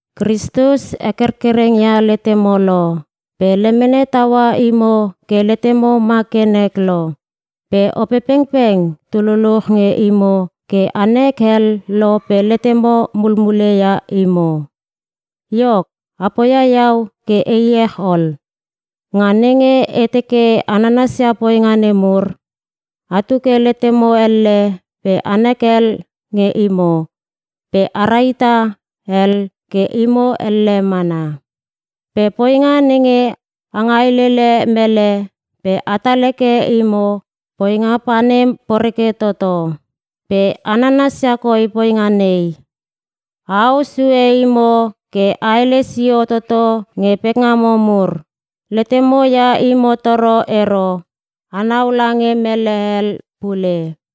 Kristus hekerkereng ia letemo lo. Pe lemene taua imo ke letemo ma ke nek lo. Pe Opepengpeng tu luluch nge imo ke a nek hel lo pe letemo mulmule ia imo. Iok, a poia iau ke e iech ol. Nga nenge e teke a nanasia poinga nemur: Atu ke letemo elle pe anek hel nge imo, pe a rahita hel ke imo elle mana. Pe poinga nenge a ngailele mele pe atal heke imo, poinga panem poreke toto. Pe a nanasia koi poinga nei: Aau sue imo ke aele sio toto nge pekngamo mur. Letemo ia imo toro ero, anau lange mele hel pule.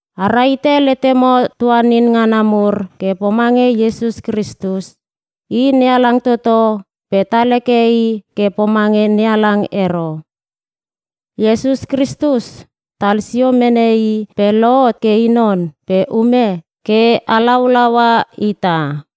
A rahite letemo tuanin ngana mur ke pomange Iesus Kristus: I NeHalang toto pe tal heke i ke pomange NeHalang ero. Iesus Kristus tal sio mene i pe lohot ke i non pe ume ke halaulaua ita.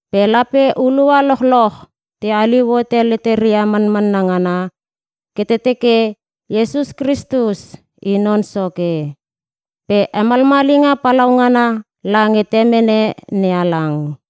Pe lape hulua lochloch te haliu hote leteria manmanna ngana ke te teke Iesus Kristus I Non Soke. Pe hemalmalinga palaungana lange Temene NeHalang.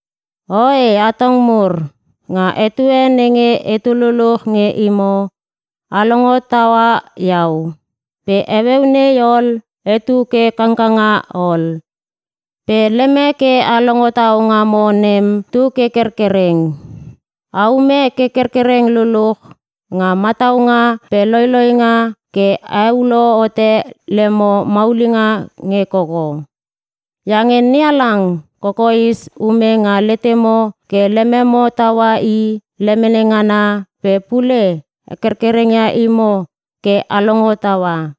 Oe atong mur, nga etue nenge etu luluch nge imo, a longo taua iau. Pe heueu nei ol etu ke kangkanga ol, pe lemek ke a longo tau ngamo nem, tu ke kerkereng. A ume ke kerkereng luluch nga mataunga pe loiloinga ke a heulo hote lemo maulinga nge koko. Iange NeHalang kokoes ume nga letemo ke lememo taua I lemene ngana pe pule hekerkereng ia imo ke a longo taua.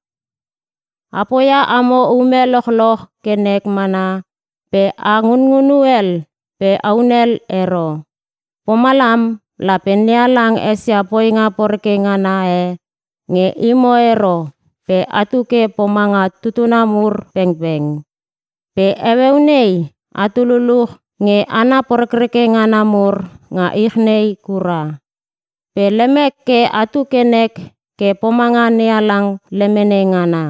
A poia amo ume lochloch ke nek mana pe a ngunngunu hel pe a hunel ero. Pomalam lape NeHalang esia poinga poreke ngana e nge imo ero pe atu ke pomanga tutuna mur pengpeng. Pe heueu nei atu luluch nge hana porekreke ngana mur nga ich nei kura. Pe lemek ke atu ke nek ke pomanga NeHalang lemene ngana.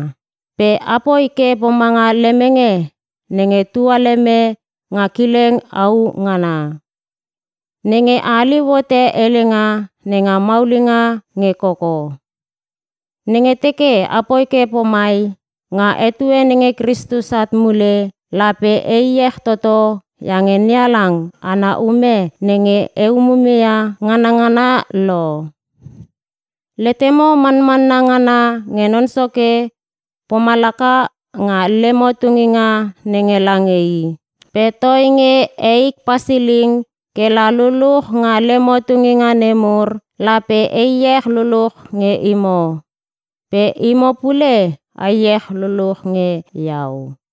Pe apoi ke pomanga lemenge nenge tua leme nga kileng au ngana. Nenge a haliu hote helenga nenga maulinga nge koko. Nenge teke a poi ke pomai, nga etue nenge Kristus at mule, lape e iech toto iange NeHalang ana ume nenge e umume ia nganangana lo. Letemo manmanna ngana nge Non Soke pomalaka nga lemo tunginga nenge lange I. Pe toinge eik pasiling ke la luluch nga lemo tunginga nemur, lape e iech luluch nge imo. Pe imo pule a iech luluch nge iau.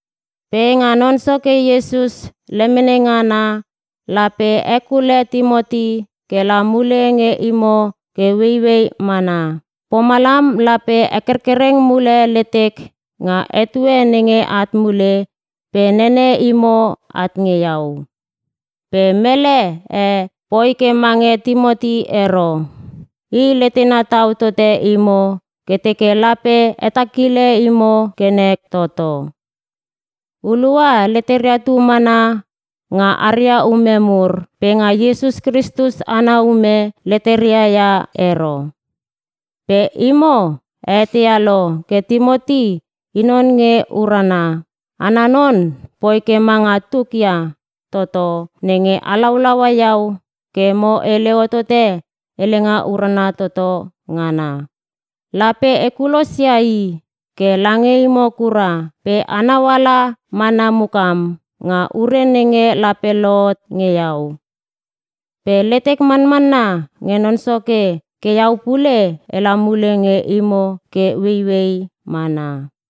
Pe nga Non Soke Iesus lemene ngana lape e hekule Timoti ke la mule nge imo ke ueiuei mana. Pomalam lape hekerkereng mule letek nga etue nenge at mule pe nene imo at nge iau. Pe mele e poi ke mange Timoti ero. I letena tau tote imo ke teke lape hetakile imo ke nek toto. Hulua leteria tu mana nga aria ume mur, pe nga Iesus Kristus ana ume, leteria ia ero. Pe imo a eteia lo ke Timoti i non nge urana. Ana non poi ke manga tuk ia toto nenge halaulaua iau ke mo hele hotote Helenga Urana Toto Ngana. Lape e kulos ia i ke lange imo kura, pe enau ala mana mukam nga ure nenge lape lohot nge iau. Pe letek manmanna nge Non Soke ke iau pule ela mule nge imo ke ueiuei mana.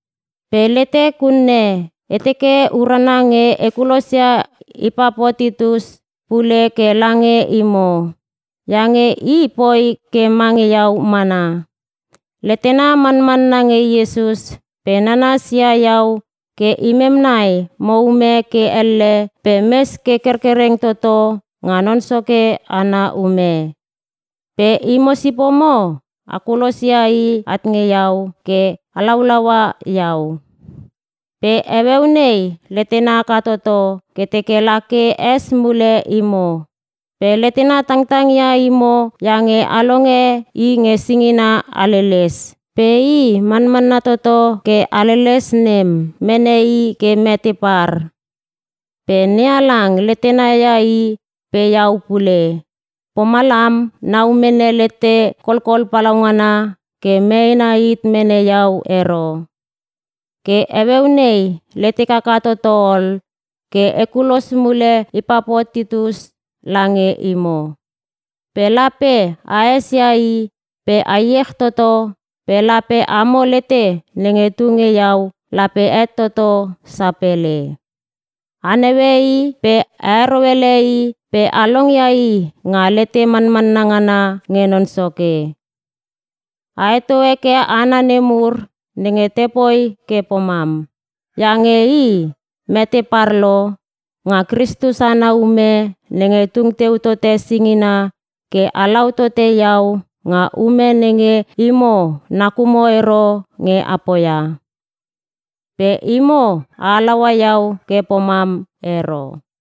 Pe letek unne, e teke urana nge e kulos ia Ipapotitus pule ke lange imo. Iange i poi ke mange iau mana: Letena manmanna nge Iesus pe nanas ia iau ke imem nai mo ume ke elle pe mes ke kerkereng toto nga Non Soke ana ume. Pe imo sipomo a kulos ia i at nge iau ke halaulaua iau. Pe heueu nei letena haka toto ke teke la ke es mule imo. Pe letena tangtang ia imo iange a longe i nge singina haleles. Pe i manmanna toto ke haleles nem mene i ke mete par. Pe NeHalang letentena ia i pe iau pule. Pomalam nau mene lete kolkol palaungana ke meena hit mene iau ero. Ke heueu nei letek haka toto ol ke e kulos mule Ipapotitus lange imo. Pe lape a esia i pe a iech toto pe lape amo lete nenge tu nge iau lape het toto sapele. A naue i pe a heroele i pe a longia i nga lete manmanna ngana nge Non Soke. A heto heke hana nemur nenge te poi ke pomam, iange i, mete par lo nga Kristus ana ume nenge tung teu tote singina ke halau tote iau nga ume nenge imo nakumo ero nge a poia. Pe imo a halaua iau ke pomam ero.